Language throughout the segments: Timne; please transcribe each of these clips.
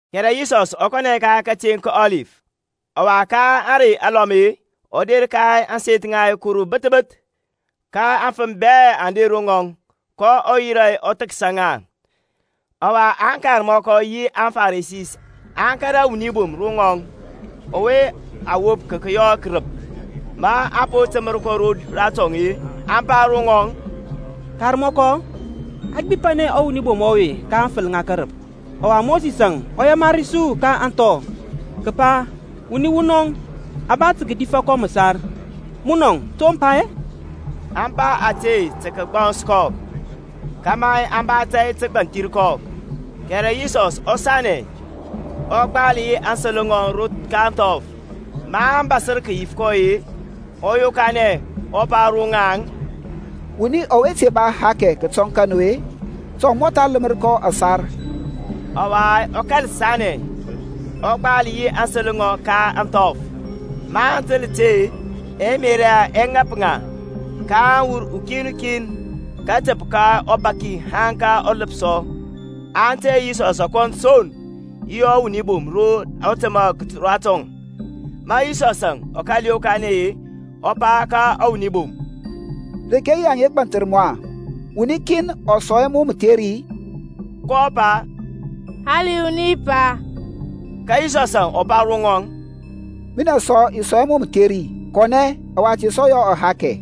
Kɛrɛ Yisɔs ɔ kɔnɛ ka kateŋ ka Ɔlif. Ɔwa ka ȧŋrey alɔm-e ɔ der ka ȧŋseth ŋa Kuru bəth bəth, ka aŋfəm bɛ aŋ der ro ŋɔŋ: kɔ yirȧ ɔ thəksa ŋa. Ɔwa aŋkarmɔkɔ yi aŋFarisi aŋ kȧrȧ wuni bom ro ŋɔŋ ɔwe a wop ka kəyɔ kərəp; ma a po təmər kɔ ratɔŋ-e, aŋ pa ro ŋɔŋ, Karmɔkɔ, a gbipanɛ ɔwuni bom ɔwe ka aŋfəl ŋa kərəp. Ɔwa Mosisȧŋ ɔ yamari su ka ȧŋthɔ, kəpa wuni wunɔŋ a ba tə kədif kɔ məsar: munɔŋ-a to mə pa-e? Aŋ pa ȧte tə kəgbɔns kɔ, kȧmȧ aŋ ba tȧy tə kəgbanthir kɔ. Kɛrɛ Yisɔsȧŋ ɔ sanɛ, ɔ gbal yi aŋsəl ŋɔŋ ka ȧŋthɔf. Maŋ bȧsər kəyif kɔ-e, ɔ yokanɛ, ɔ pa ro ŋaŋ, Wuni ɔwe te ba ahakɛ kətɔŋ ka nu-e, ta ɔ mɔtha ləmər kɔ ȧsar. Ɔwa ɔ kȧl sanɛ, ɔ gbal yi aŋsəl ŋɔŋ ka ȧŋthɔf. Maŋ təl ti-e, ɛmerȧ yaŋ ɛ ŋap ŋa, kaŋ wur ukin kin, kətəp ka ɔbaki haŋ ka ɔləpsɔ; aŋ tey Yisɔsȧŋ kɔn son, yi ɔwuni bom ro ɔ təmȧ ratɔŋ. Ma Yisɔsȧŋ ɔ kȧl yokanɛ-e, ɔ pa ka ɔwuni bom, Reke yi aŋa gbanthir mu-a, wuni kin ɔ sɔŋ hɛ mu mətheri-i? kɔ pa, Hali wuni, Pa. Ka Yisɔsȧŋ ɔ pa ro ŋɔŋ, Minɛ sɔ i sɔŋ hɛ mu mətheri; kɔnɛ, ɔwa te sɔ yɔ ahakɛ.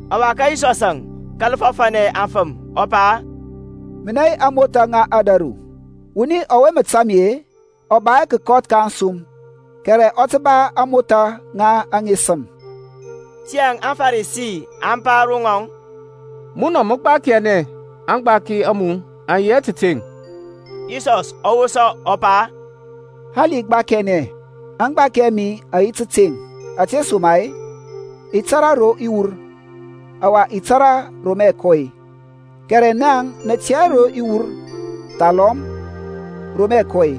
Ɔwa Yisɔsȧŋ ɔ kȧl fɔfȧnɛ aŋfəm, ɔ pa, Minɛ yi ȧŋmothȧ ŋa ȧdȧru; wuni ɔwe mə tȧŋ mi-e ɔ ba hɛ kəkɔth ka ȧŋsum, kɛrɛ ɔ tə ba ȧŋmothȧ ŋa aŋesəm. Tiyȧŋ aŋFarisi aŋ pa ro ŋɔŋ, Munɔ mə gbakiɛnɛ; aŋgbaki a mu aŋ yi hɛ tȧteŋ. Yisɔs ɔ wosa ɔ pa, Hali i gbakiɛnɛ, aŋgbaki a mi aŋ yi tȧteŋ: ȧtesoma-e, i tȧrȧ ro i wur, ɔwa i tȧrȧ ro mə i kɔ-e; kɛrɛ naŋ nə tɛ hɛ ro i wur, thalɔm ro mə i kɔ-e.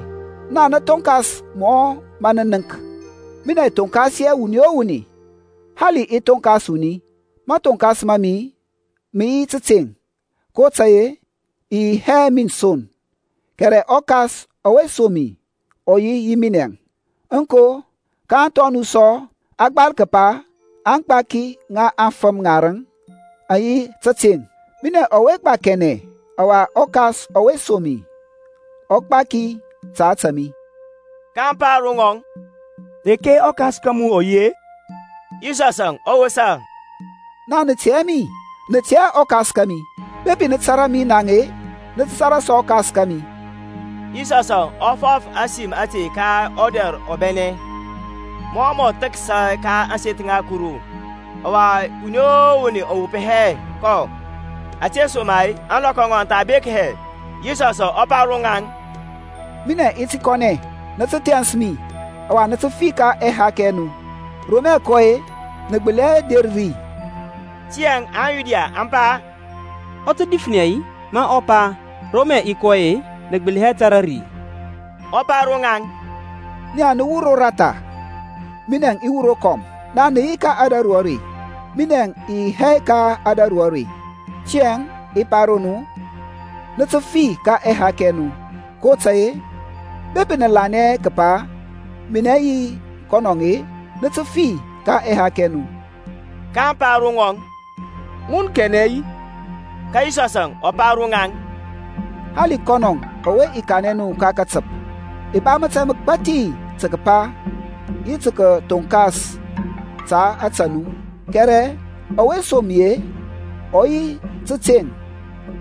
Naŋ nə thonkas mɔ mə nə nənk; minɛ i thonkas hɛ wuni o wuni. Hali i thonkas wuni, mathoŋkas ma mi mə yi tȧteŋ; kotȧy-e i yi hɛ min son, kɛrɛ ɔKas ɔwe som mi ɔ yi yi minɛ. Aŋko, ka ȧŋthɔ a nu sɔ a gbal kəpa aŋgbaki ŋa afəm ŋarəŋ aŋ yi tȧteŋ. Minɛŋ ɔwe gbakiɛnɛ, ɔwa ɔKas ɔwe som mi ɔ gbaki ta ȧtȧ mi. kaŋ pa ro ŋɔŋ, Reke ɔKas ka mu ɔ yi-e? Yisɔsȧŋ ɔ wosa, Naŋ nə tɛ hɛ mi, nə tɛ hɛ ɔKas kȧmi: bepi nə tȧrȧ mi naŋ-e, nə tə tȧrȧ sɔ ɔKas kȧmi. Yisɔsȧŋ ɔ fɔf ȧsim ȧte ka ɔdɛr ɔbɛnɛ, mɔ mɔ thəksa ka ȧŋseth ŋa Kuru: ɔwa wuni o wuni ɔ wop hɛ kɔ; ȧtesoma-e ȧŋlɔkɔ ŋɔŋ aŋ tha bek hɛ. Yisɔsȧŋ ɔ pa ro ŋaŋ, Minɛŋ i ti kɔnɛ, nə tə thɛns mi, ɔwa nə tə fi ka ɛhakɛ ɛ nu; ro mə i kɔ-e, nə gbəli hɛ der ri. Tiyȧŋ aŋYuda aŋ pa, Ɔ tə difnɛ-i, ma ɔ pa, Ro mə i kɔ-e, nə gbəli hɛ der ri-i? Ɔ pa ro ŋaŋ, Nia nə wur roratha, minɛŋ i wur rokɔm: nia nə yi ka ȧdȧru are; minɛŋ i yi hɛ ka ȧdȧru are. Tiyȧŋ i pa ro nu, nə tə fi ka ɛhakɛ ɛ nu: kotȧy-e bepi nə lanɛ hɛ kəpa minɛ yi kɔn-e, nə tə fi ka ɛhakɛ ɛ nu kaŋ pa ro ŋɔŋ, Mun kanɛ-i? Ka Yisɔsȧŋ ɔ pa ro ŋaŋ, Hali kɔnɔŋ ɔwe i kanɛ nu ka katəp. I ba mȧtȧy məgbathi tə kəpa yi tə kəthoŋkas ta ȧtȧ nu: kɛrɛ ɔwe som mi-e ɔ yi tȧteŋ;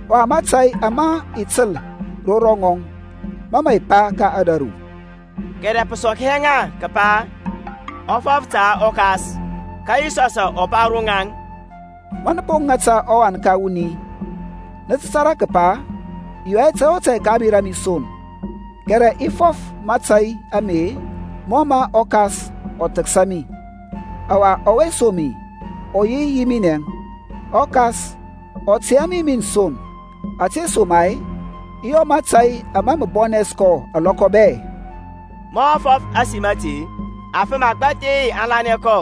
ɔwa mȧtȧy ama i təl ro ŋɔŋ mȧ mə i pa ka ȧdȧru. Kɛrɛ pə sɔk hɛ ŋa kəpa ɔ fɔf ta ɔKas. Ka Yisɔsȧŋ ɔ pa ro ŋaŋ, Ma nə po ŋata ɔWan ka wuni, nə tə tȧrȧ kəpa i yɔ hɛ tȧy o tȧy ka ȧŋmerȧ a mi son: kɛrɛ i fɔf mȧtȧy ame mɔ mə ɔKas ɔ thəksa mi. Ɔwa ɔwe som mi ɔ yi yi minɛŋ: ɔKas ɔ tey hɛ mi min son; ȧtesoma-e i yɔ mȧtȧy ama mə bɔnɛs kɔ alɔkɔ bɛ. Ma ɔ fɔf ȧsim ȧte-e, afəm agbȧthi aŋ lanɛ kɔ.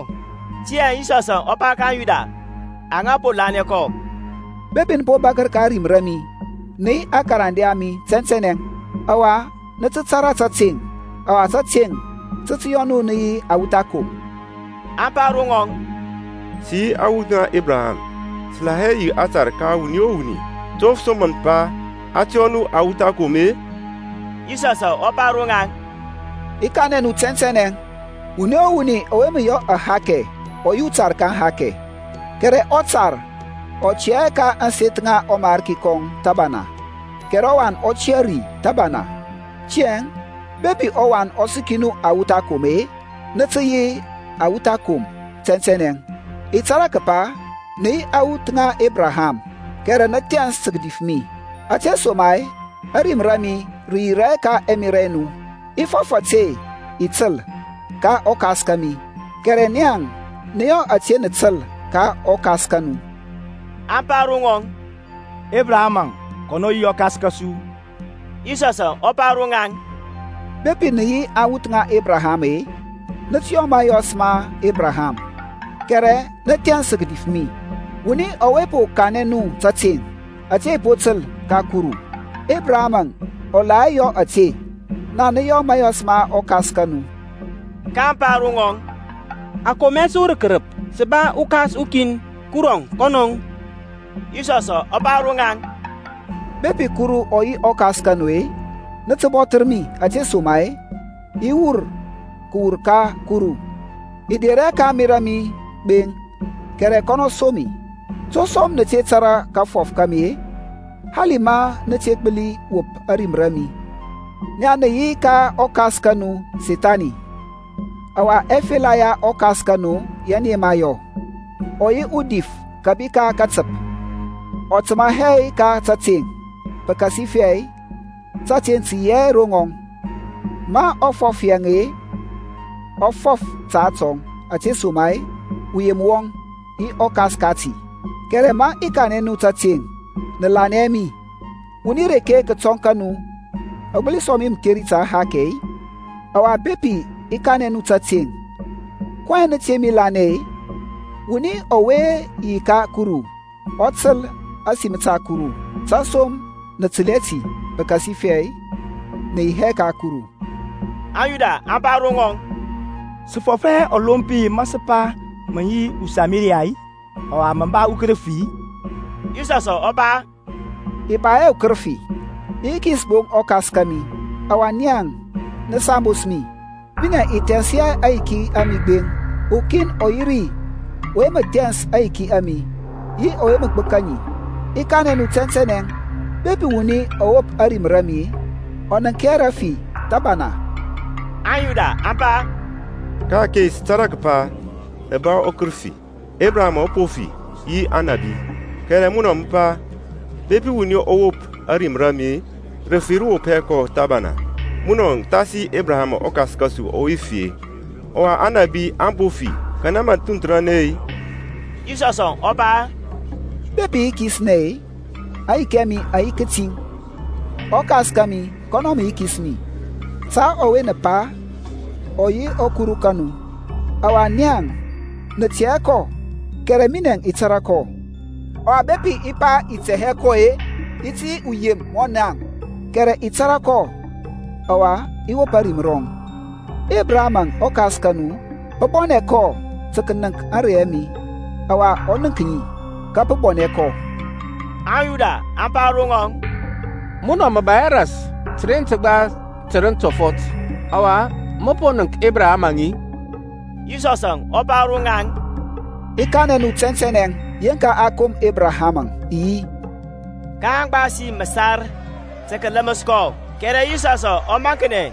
Tiyȧŋ Yisɔsȧŋ ɔ pa ka aŋYuda aŋa po lanɛ kɔ, Bepi nə po bȧkər ka ȧrim ra mi, nə yi aŋkarande a mi tɛntɛnɛ; ɔwa nə tə tȧrȧ tȧteŋ, ɔwa tȧteŋ tə tə yɔ nu nə yi awuth akom. Aŋ pa ro ŋɔŋ, Sə yi awuth ŋa Ebraham, sə la hɛ yi atar ka wuni o wuni: to pə som mə pa, A tə yɔ nu awuth akom-e? Yisɔsȧŋ ɔ pa ro ŋaŋ, I kanɛ nu tɛntɛnɛ, wuni o wuni ɔwe mə yɔ ahakɛ ɔ yi utar ka ahakɛ. Kɛrɛ ɔtar ɔ tiyȧ hɛ ka ȧŋseth ŋa ɔmarki kɔŋ thəbana; kɛrɛ ɔwan ɔ tə tiyȧ ri thəbana. Tiyȧŋ bepi ɔWan ɔ səki nu awuth akom-e, nə tə yi awuth akom tɛntɛnɛ. I tȧrȧ kəpa nə yi awuth ŋa Ebraham: kɛrɛ nə thɛns tə kədif mi, ȧtesoma-e ȧrim ra mi rə yirȧ hɛ ka ɛmerȧ ɛ nu. I fɔf ȧte i təl ka ɔKas kȧmi: kɛrɛ naŋ nə yɔ ȧte nə təl ka ɔkas ka nu. Aŋ pa ro ŋɔŋ, Ebraham-əŋ kɔnɔ yi ɔkas kȧsu. Yisɔsȧŋ ɔ pa ro ŋaŋ, Bepi nə yi awuth ŋa Ebraham-e, nə tə yɔ mȧyɔs ma Ebraham. Kɛrɛ nə thɛns tə kədif mi, wuni ɔwe po kanɛ nu tȧteŋ, ȧte i po təl ka Kuru: Ebraham-əŋ ɔ la hɛ yɔ ȧte. Naŋ nə yɔ mȧyɔs ma ɔkas ka nu. Kaŋ pa ro ŋɔŋ, A kom hɛ su rə kərəp, sə ba uKas ukin, Kurɔŋ kɔnɔŋ. Yisɔsȧŋ ɔ pa ro ŋaŋ, Bepi Kurɔŋ ɔ yi ɔKas ka nu-e, nə tə bɔthər mi: ȧtesoma-e, i wur kəwur ka Kuru; i der hɛ ka ȧŋmerȧ a mi gbeŋ, kɛrɛ kɔnɔ som mi. To som nə te tȧrȧ kafɔf ka mi-e? Hali ma nə te gbəli wop ȧrim ra mi. Nia nə yi ka ɔkas ka nu Sethani, ɔwa ɛfela ya ɔkas ka nu yɛ nə yema yɔ. Ɔ yi udif kȧbi ka katəp, ɔ təmȧ hɛ ka tȧteŋ, pəkasifɛ tȧteŋ tə yi hɛ ro ŋɔŋ. Ma ɔ fɔf rəyem-e, ɔ fɔf ta atɔŋ: ȧtesoma-e uyem wɔŋ, yi ɔkas kati. Kɛrɛ ma i kanɛ nu tȧteŋ, nə lanɛ hɛ mi. Wuni reke kətɔŋ ka nu ɔ gbəli sɔŋ mi mətheri ta ahakɛ-e? Ɔwa bepi i kanɛ nu tȧteŋ, kɔyɛŋ nə te mi lanɛ-e? Wuni ɔwe yi ka Kuru ɔ təl ȧsim ta Kuru: tesom nə təl hɛ ti, pəkasifɛ nə yi hɛ ka Kuru. AŋYuda aŋ pa ro ŋɔŋ, Sə fɔf hɛ ɔlompi ma sə pa mə yi uSamariya-i, ɔwa mə ba ukərəfi-i? Yisɔsȧŋ ɔ pa, I ba hɛ ukərəfi: i yikis gbo ɔKas kȧmi, ɔwa nia nə sambos mi. Minɛŋ i thɛns hɛ aŋyiki a mi gbeŋ: ukin ɔ yi ri ɔwe mə thɛns aŋyiki a mi, yi ɔwe mə gbəka ŋi. I kanɛ nu tɛntɛnɛ, Bepi wuni ɔ wop ȧrim ra mi, ɔ nənk hɛ rafi thəbana. AŋYuda aŋ pa, Ka-ake sə tȧrȧ kəpa mə ba ukərəfi. Ebraham-əŋ ɔ po fi, yi Aŋnȧbi: kɛrɛ munɔ mə pa, Bepi wuni ɔ wop ȧrim ra mi, rəfi rə wop hɛ kɔ thəbana. Munɔ mə thasi Ebraham ɔkas kȧsu ɔwe fi, ɔwa Aŋnȧbi aŋ po fi: kanɛ mə thunthəranɛ-e? Yisɔsȧŋ ɔ pa, Bepi i yikisnɛ-e, aŋyiki a mi aŋ yi kətiŋ; ɔKas kȧmi kɔnɔ mə yikis mi; ta ɔwe nə pa ɔ yi ɔKuru ka nu. Ɔwa nia nə tɛ hɛ kɔ, kɛrɛ minɛ i tȧrȧ kɔ: ɔwa bepi i pa i tɛ hɛ kɔ-e, i ti yi uyem mɔ niaŋ: kɛrɛ i tȧrȧ kɔ, ɔwa i wop ȧrim rɔŋ. Ebraham-əŋ ɔkas ka nu, pə bɔnɛ kɔ tə kənəŋk ȧŋrey a mi, ɔwa ɔ nənk ŋi, ka pə bɔnɛ kɔ. AŋYuda aŋ pa ro ŋɔŋ, Munɔ mə ba hɛ ras təren təgba tərəŋ tɔfɔt, ɔwa mə po nənk Ebrahamȧŋ-i? Yisɔsȧŋ ɔ pa ro ŋaŋ, I kanɛ nu tɛntɛnɛ, Yeŋka a kom Ebraham-əŋ, I yi. kaŋ gbasi məsar tə kələməs kɔ: kɛrɛ Yisɔsȧŋ ɔ maŋknɛ,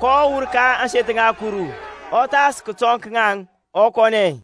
kɔ wur ka ȧŋseth ŋa Kuru, ɔ thas kətɔŋ ka ŋaŋ, ɔ kɔnɛ.